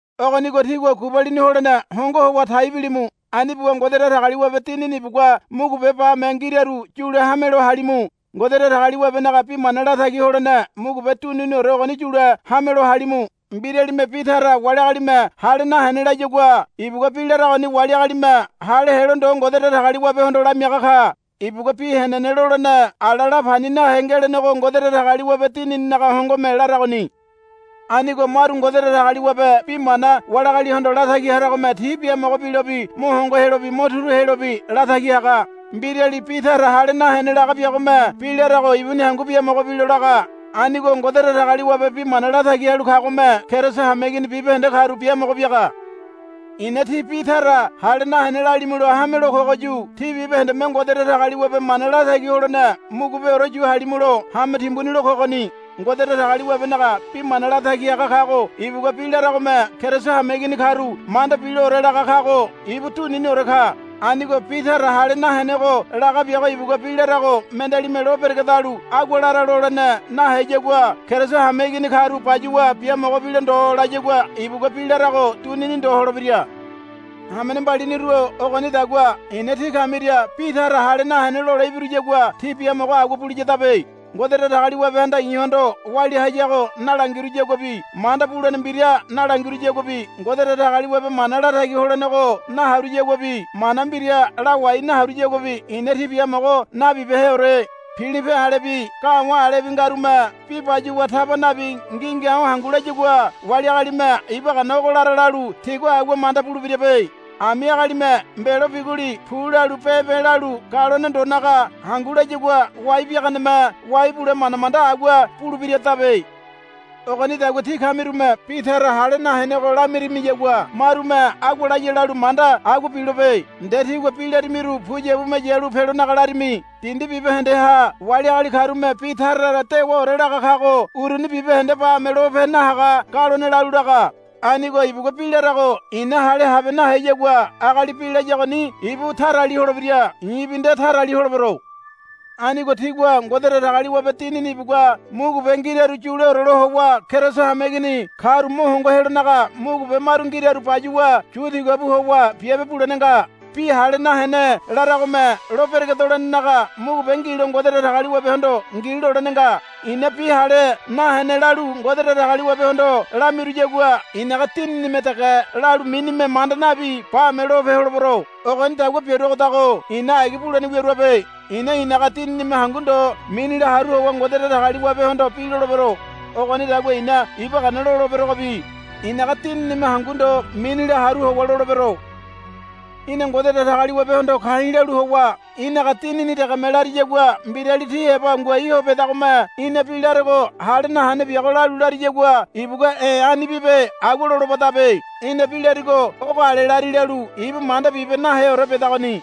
Ogonigo tígua gubalini holene hongo howa tai bilimu. Ani buwa Ngode Datagaliwabe Dinini ibugua mugube bame ngiraru yule hamelo halimu. Ngode Datagaliwabenaga bi mana latagi holene mugube duniniore ogoni yule hamelo halimu. Mbiralime bi tara wali agalime hale nahene layagua ibugua bi laragoni wali agalime hale helo ndo Ngode Datagaliwabehondo lamiaga ka. Ibugua bi henene lolene ala la pani nahe ngelenego Ngode Datagaliwabe Dinininaga hongome laragoni. Anigo maru Ngode Datagaliwabe bi mana wali agalihondo latagi haragome ti biamogo bilobi mo hongo helobi mo turu helobi latagi haga. Mbirali bi tara hale nahene laga biagome bi larago ibuni hangu biamogo bilo laga. Anigo Ngode Datagaliwabe bi mana latagi halu kagome Keriso hameigini bibahende karu biamogo biaga. I̱na tí bi tara hale nahene lalimulo hamelo kogoyu tí bibahendeme Ngode Datagaliwabe mana latagi holene mugubeore yu halimulo hame timbuni lo kogoni. Ngode Datagaliwabenaga bi mana latagi haga kago ibugua bi laragome Keriso hameigini karu manda biloore laga kago ibu duniniore ka. Anigo bi tara hale nahenego laga biago ibugua bi larago mendealime lo beregedalu agua lara lolene naheyagua Keriso hameigini karu bayuwa biamogo bilo ndo layagua ibugua bi larago dunini ndo holebira. Hamene mbaliniru-o ogonidagua i̱na tí kamiria bi tara hale nahene lole ibiruyagua tí biamogo agua buliyadabe. Ngode Datagaliwabehanda i̱hondo walia hayago nalangiruyaguabi manda bulene mbira nalangiruyaguabi Ngode Datagaliwabe mana latagi holenego naharuyaguabi mana mbira lawai naharuyaguabi i̱na tí biamogo nabibeheore. Pilipe alebi ga̱wa̱ alebi ngarume bi bayuwa taba nabi ngi̱ngi̱a̱o̱ hangu layagua wali agalime iba gana ogo lara lalu ti agua manda bulebirabe. Ami agalime mbelo biguli pu lalu be̱be̱ lalu galone ndonaga hangu layagua wai biaganeme wai bule manda manda agua bulebiradabe. Ogonidagua tí kamirume bi tara hale nahenego lamirimiyagua marume agua laya lalu manda agua bilobe. Nde tígua bi larimiru puyabume yalu pelonaga larimi. Dindi bibahendeha wali agali karume bi tara tara dewaore laga kago uruni bibahende bame lope nahaga galone lalu laga. Anigo ibugua bi larago i̱na hale habe naheyagua agali bi layagoni ibu tarali holebira. I̱bi nde tarali holebero. Anigo tígua Ngode Datagaliwabe Dinini ibugua mugube ngiraru yuleore lo howa Keriso hameigini karu mo hongo helonaga mugube maru ngiraru bayuwa yu tiga bu howa biabe bulene nga. Bi hale nahene laragome lo beregedolenenaga mugube ngilo Ngode Datagaliwabehondo ngi lolene nga. I̱na bi hale nahene lalu Ngode Datagaliwabehondo lamiruyagua i̱naga dininime dege lalu minime manda nabi bame lope holebero. Ogonidagua biaruagodago i̱na agi bulene wiaruabe. I̱na i̱naga dininime hangu ndo minila haru howa Ngode Datagaliwabehondo bi lolebero. Ogonidagua i̱na iba gana loleberogobi i̱naga dininime hangu ndo minila haru howa lolebero. Í̠na Ngode Datagaliwabehondo ka̱i̱ lalu howa í̠naga dinini degeme lariyagua mbirali tí heba ngoai ho bedagome í̠na bi larego hale nahene biago lalu lariyagua ibugua, E̱ ani bibe, agua lolobadabe. Í̠na bi larigo ogo ale lari lalu ibu manda bibe naheore bedagoni.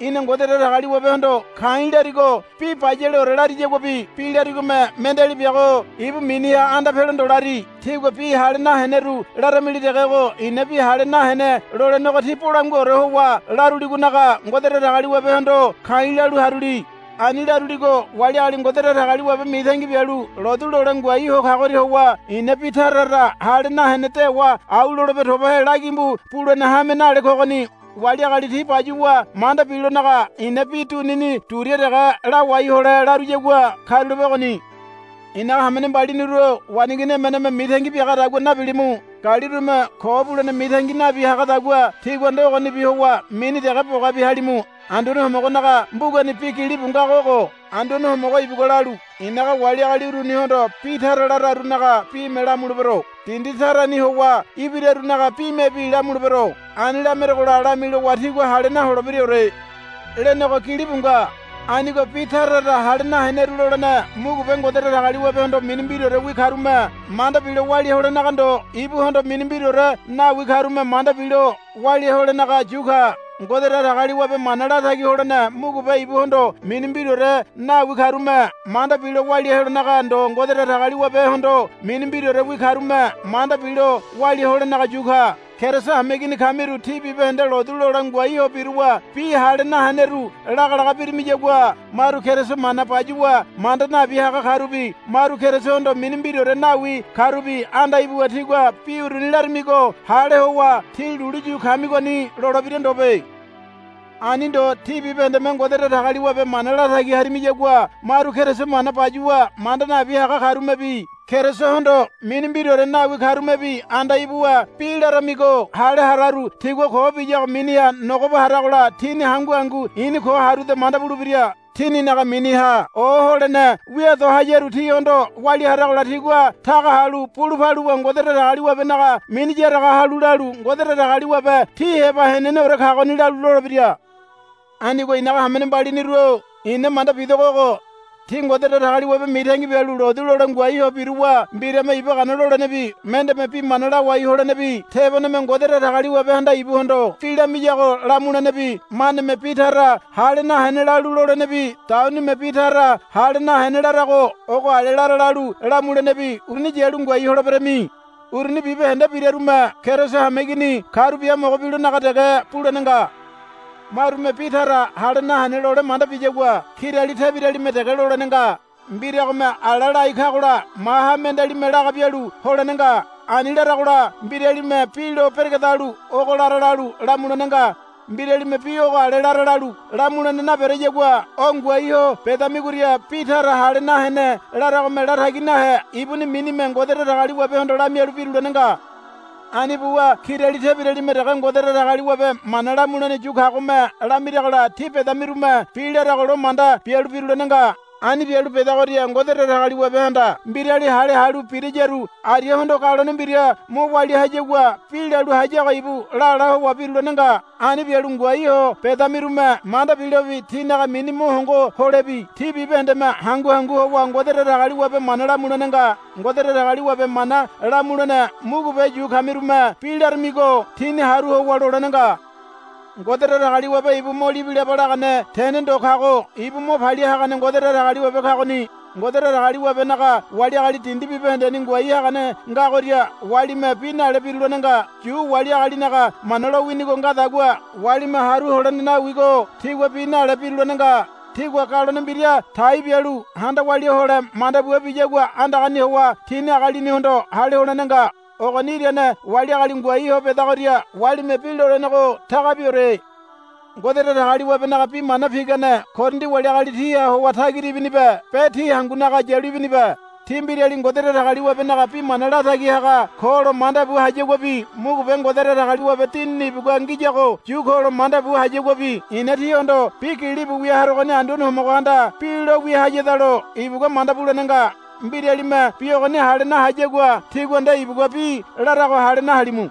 Í̠na Ngode Datagaliwabehondo ka̱i̱ larigo bi bayaleore lariyaguabi bi larigome mendeali biago ibu miniha anda pelo ndo lari. Tígua bi hale naheneru laramili degego i̱na bi hale nahene lolenego tí bolanguaore howa laruligonaga Ngode Datagaliwabehondo ka̱i̱ lalu haruli. Ani laruligo wali agali Ngode Datagaliwabe mitangi bialu lotu lole ngoai ho kagoria howa i̱na bi tara tara hale nahene dewa au lolebe tobahe lagimbu bulene hame nale kogoni. Wali agali ti bayuwa manda bilonaga i̱na bi dunini duria dege lawai hole laruyagua karulape ogoni. I̱naga hamene mbaliniru-o waneigini emeneme mitangi biagadagua nabilimu. Galirume ko bulene mitangi nabi hagadagua tígua nde ogonibi howa mini dege bogabi halimu. Anduane Homogonaga mbugani bi gilibu ngago ogo, Anduane Homogo ibugua lalu, I̱naga wali agali urunihondo bi tara lararunaga bime lamulebero. Dindi tarani howa ibirarunaga bimebi lamulebero. Ani lamerogola lamilowa tigua hale naholebiraore, lenego gilibu nga. Anigo bi tara tara hale naheneru lolene mugube Ngode Datagaliwabehondo mini mbiraorewi karume manda bilo walia holenaga ndo ibuhondo mini mbiraore nawi karume manda bilo walia holenaga yu ka. Ngode Datagaliwabe mana latagi holene mugube ibuhondo mini mbiraore nawi karume manda bilo walia holenaga ndo Ngode Datagaliwabehondo mini mbiraorewi karume manda bilo walia holenaga yu ka. Keriso hameigini kamiru tí bibahende lotu lole ngoai ho biruwa bi hale naheneru lagalaga birimiyagua maru Keriso mana bayuwa manda nabi haga karubi maru Kerisohondo mini mbiraore nawi karubi anda ibuwa tigua bi uruni laramigo hale howa tí lulu yu kamigoni lolebira ndobe. Ani ndo tí bibahendeme Ngode Datagaliwabe mana latagi harimiyagua maru Keriso mana bayuwa manda nabi haga karumebi Kerisohondo mini mbiraore nawi karumebi anda ibuwa bi laramigo hale hararu tigua ko biyago miniha nogoba haragola tini hangu hangu i̱ni ko haruda manda bulebira. Tininaga miniha oholene wia do hayaru tihondo walia haragola tigua taga halu bulu paluwa Ngode Datagaliwabenaga mini yaraga halu lalu, Ngode Datagaliwabe tí heba heneneore kagoni, lalu lolebira. Anigo i̱naga hamene mbaliniru-o i̱na manda bidogo ogo. Tí Ngode Datagaliwabe mitangi bialu lotu lole ngoai ho biruwa mbirame iba gana lolenebi mendeme bi mana lawai holenebi teboneme Ngode Datagaliwabehanda ibuhondo bi lamiyago lamulenebi maneme bi tara hale nahene lalu lolenebi daunime bi tara hale nahene larago ogo ale lara lalu lamulenebi uruni yalu ngoai holeberami. Uruni bibahende birarume Keriso hameigini karu biamogo bilonaga dege bulene nga. Marume bi tara hale nahene lole manda biyagua kirali tebiralime dege lolene nga. Mbiragome ala lai kagola maha mendealime laga bialu holene nga. Ani laragola mbiralime bi lo beregedalu ogo lara lalu lamulene nga. Mbiralime bi ogo ale lara lalu lamulene nabereyagua o ngoai ho bedamigoria bi tara hale nahene laragome latagi nahe ibuni minime Ngode Datagaliwabehondo lamialu birulene nga. Ani buwa kirali tebiralime dege Ngode Datagaliwabe mana lamulene yu kagome lamiragola tí bedamirume bi larago lo manda bialu birulene nga. Ani bialu bedagoria Ngode Datagaliwabehanda mbirali hale halu birayaru ariahondo galone mbira mo walia hayagua bi lalu hayago ibu lala howa birulene nga. Ani bialu ngoai ho bedamirume manda bilobi tinaga mini mo hongo holebi tí bibahendeme hangu hangu howa Ngode Datagaliwabe mana lamulene nga. Ngode Datagaliwabe mana lamulene mugube yu kamirume bi laramigo tíni haru howa lolene nga. Ngode Datagaliwabe ibu mo libilaba lagane tene ndo kago ibu mo palia hagane Ngode Datagaliwabe kagoni. Ngode Datagaliwabenaga wali agali dindi bibahendeni ngoai hagane ngagoria walime bi nale birulene nga. Yu wali agalinaga Mana lowinigo ngadagua walime haru holene nawigo tigua bi nalebi birulene nga. Tigua galone mbira tai bialu handa walia hole manda bua biyagua andagani howa tini agalinihondo hale holene nga. Ogoni irane wali agali ngoai ho bedagoria walime bi lolenego tagabiore. Ngode Datagaliwabenaga bi mana pigane Korindi wali agali tíha howa tagira ibinibe be tí hangunaga yalu ibinibe. Tí mbirali Ngode Datagaliwabenaga bi mana latagi haga kolo manda bu hayaguabi mugube Ngode Datagaliwabe Dinini ibugua ngiyago yu kolo manda bu hayaguabi i̱na tíhondo bi gilibu wia harogoni Anduane Homogohanda bi lo wia hayadalo ibugua manda bulene nga. Mbiralime bi ogoni hale nahayagua tígua nde ibugua bi larago hale nahalimu.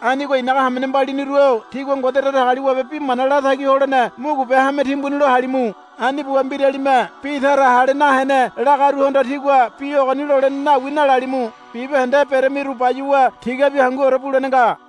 Anigo i̱naga hamene mbaliniru-o tígua Ngode Datagaliwabe bi mana latagi holene mugube hame timbuni lo halimu. Ani buwa mbiralime bi tara hale nahene lagaruhondo, Tígua bi ogoni lolene nawi, nalalimu. Bibahende beremiru bayuwa tigabi hanguore bulene nga.